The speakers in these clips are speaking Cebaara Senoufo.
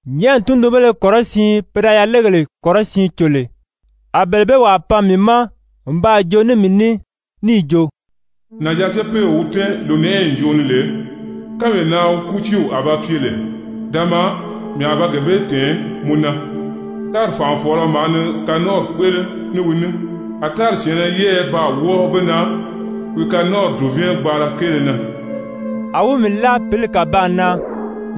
Nyɛ̀ʔɛni tundunbéle kɔrɔsiin pe da yalegèle kɔrɔsiin cò lè, a bele bee wàa pan mii ma n baa joo ní mii ní níì jo: «Nànjaa-cepeew wi tɛ́ɛn lònɛʔɛyi ǹjoʔo ni lè, kánmee na wi kútiiw a ba pye lè, da maa, mii a ba gee bee tɛ̀ɛn mɔ na. Tári fànʔafɔɔlɔ maa ni kanɔnʔɔri kpéʔele ní wi ní, a tári syɛ̀ɛnnɛ yɛ́ɛyɛ baa wɔ́ɔ be na wi kanɔnʔɔri dùvɛɛn gbaala kéele na.» A wi mii láa pǐli kàbaan na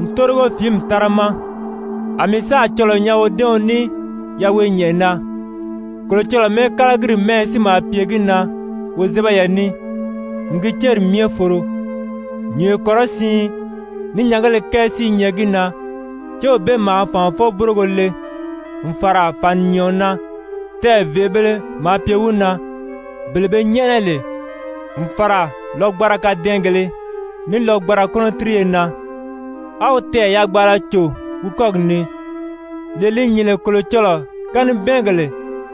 n tórigo fìimɛ tára ma. A mii sáà cɔlɔɔ nyaa wodɛ́ɛɔn ní yaweenyɛnʔɛ na, Kolocɔlɔɔ mɛ́ɛkalagiri mɛ́ɛyɛ si maa pye gi na wozɛbɛyɛ ní n gi céri myɛ foro, nyùnyo kɔrɔsiin ní nyɛngéle kɛɛ si i nyɛ gi na. Céw bee maa fànʔafɔ-búrogo le n fàra fàninyɛɛɔn na, tɛɛ̀ vèʔebēle maa pye wi na, bele be nyɛ́ʔɛnɛ lè, n fàra lɔgbanra kadɛɛngèlē ní lɔgbanra kɔ́nɔtiriye na. A wi tɛɛ̀ yagbaala cò wi kɔ́gi ni, lee li nyìn lè Kolocɔlɔɔ kanibɛɛngèle,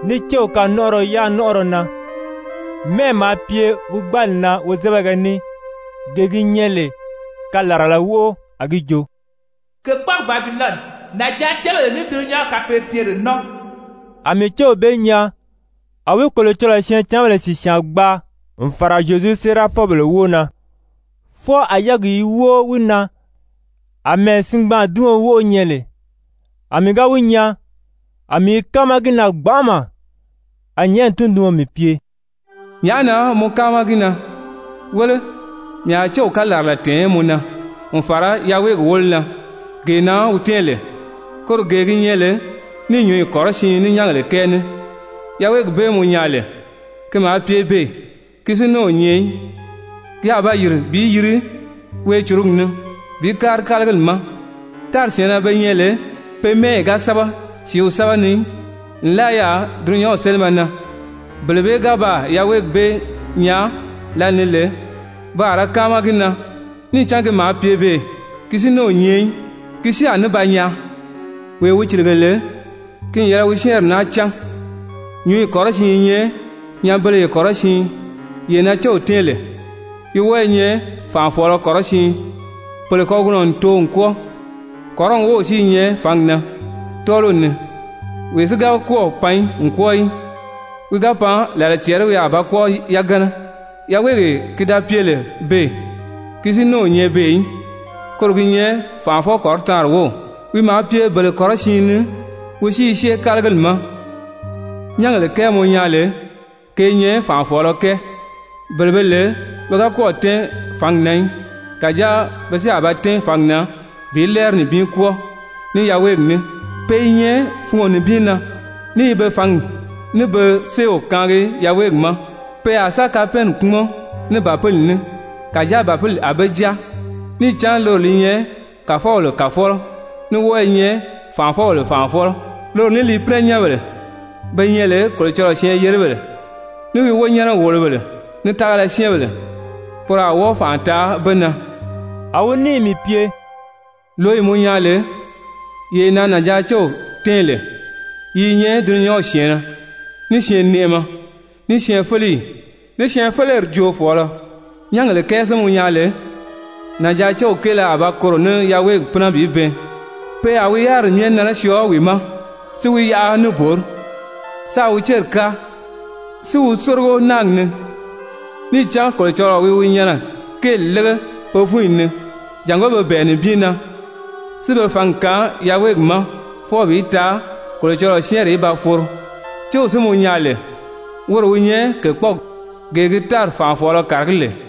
ní céw kanɔnʔɔrɔ yanɔnʔɔrɔ na. Mɛ́ʔɛ maa pye wi gbáali na wozɛbɛgɛ ní, gee gi nyɛ lè kalarala wóʔo, a gi jo: «Kèkpɔɔgi Babilɔni, nànjaacebèle ní dulunyanw kapeebyere nɔ́ɔ.» A mii céw bee nyaa a wi Kolocɔlɔɔ syɛɛncanbèle sìsyaan gbaa n fàra Zyezu séerafɔbèle wóo na, fwɔɔ a yɛ́ɛgi i wóo wi na àmɛɛ singbaadiɔn wóʔo nyɛ lè. A mii ga wi nyaa, a mii i káama gi na gbanʔama. A nyɛ̀ʔɛni tunduɔn mii pye: «Nyàʔá na mɔ káama gi na? Wéle, mii a céw kalarala tɛ̀ɛn mɔ na, n fàra yaweegi wólo na, gee na wi tɛ́ɛn lè, koro gee gi nyɛ lè ní nyǔnyi kɔrɔsiin, ní nyɛ́ngèle kɛɛ ní. Yaweegi bee mɔ nyaa lè, ki maa pye beè, ki si ní o nyɛ í. Ki a ba yìri bi yiri weecurugi ni bi kári kálagili ma. Tári syɛ̀ɛnnɛ be nyɛ lè pe mɛ́ɛyi ga sɛ́bɛ sìíw sɛ́bɛ ni í nlaa yaà dulunyanw sélimɛ na, bele bee ga baa yaweegi bee nyaa lǎlee ni lè, pe a ra káama gi na, níì cán ki maa pye beè, ki si ní o nyɛ í, ki si a ní ba nyaa. Wee wi cìlige lè, ki n yɛlɛ wi syɛ́ɛnri naa cán, nyǔnyi kɔrɔsiin i nyɛ nyanbeleye kɔrɔsiin yee na céw tɛ́ɛn lè. Yi wɔ́ɔ i nyɛ fànʔafɔɔlɔ kɔrɔsiin, pèle kagunɔ n too n kwɔ́ɔ, kɔrɔni wów si i nyɛ fǎngi na tɔ́ɔliw ni, wee si ga kɔ́ɔ̀ pan n kwɔ́ɔ í, wi ga pan, làla cɛɛri wi a ba kwɔ́ɔ yagana. Yaweegee ki da pye lè beè, ki si ní o nyɛ beè í, koro gi nyɛ fànʔafɔ-kɔrɔtaanri wów. Wi maa pye bele kɔrɔsiin ni, wi si i syée kálagili ma. Nyɛ́ngèle kɛɛ mɔ nyaa lè, ke i nyɛ fànʔafɔɔlɔ kɛɛ, bele be lè pe ga kɔ́ɔ̀ tɛ́ɛn fǎngi na í, kàjáa pe si a ba tɛ́ɛn fǎngi na bi lɛ́ɛri nibin kwɔ́ɔ ní yaweegi ní. Pe i nyɛ fungo nibin na ní i be fǎngi, ní be séew kaangi yaweegi ma. Pe a sa kapɛɛnni kpúmɔn ní Bàpili ní, kàjáa Bàpili a be jáa, níì cán loro li nyɛ kàfɔbèle Kàfɔlɔ, ní wɔ́ɔ i nyɛ fànʔafɔbèle Fànʔafɔlɔ. Loro ní li pínɛnyɛnbèle be nyɛ lè Kolocɔlɔɔ syɛɛn-yeribèle, ní wi wonyɛnɛ-wòlobèle, ní tágala syɛ́ɛnbèle, poro a wɔ́ɔ fànʔa taa be na.» A wi níì mii pye: «Lǒyi mɔ nyaa lè, yee na nànjaacew tɛ́ɛn lè, yi i nyɛ dulunyanw syɛ̀ɛnnɛ, ní syɛɛnnɛʔɛmɛ, ní syɛɛnfeleyi, ní syɛɛnfeleri joofɔɔlɔ. Nyɛ́ngèle kɛɛ si mɔ nyaa lè, nànjaacew kéele a ba koro ní yaweegi pínɛ bi bɛɛn, pe a wi yáriri myɛ nɛnɛ syɔɔ wi ma, si wi yaʔa níbori, sáā wi céri káa, si wi sórigo náagi ni. Níì cán Kolocɔlɔɔ wi wi nyɛnɛ kéeli lége pe fúnyi ni jàngó pe bɛ̀ɛ nibin na, si be fǎngi kaan yaweegi ma fwɔɔ bi taa Kolocɔlɔɔ syɛ́ɛnri í ba foro. Céw si mɔ nyaa lè, woro wi nyɛ kèkpɔɔgi, gee gi tári fànʔafɔɔlɔ kàragí lè.»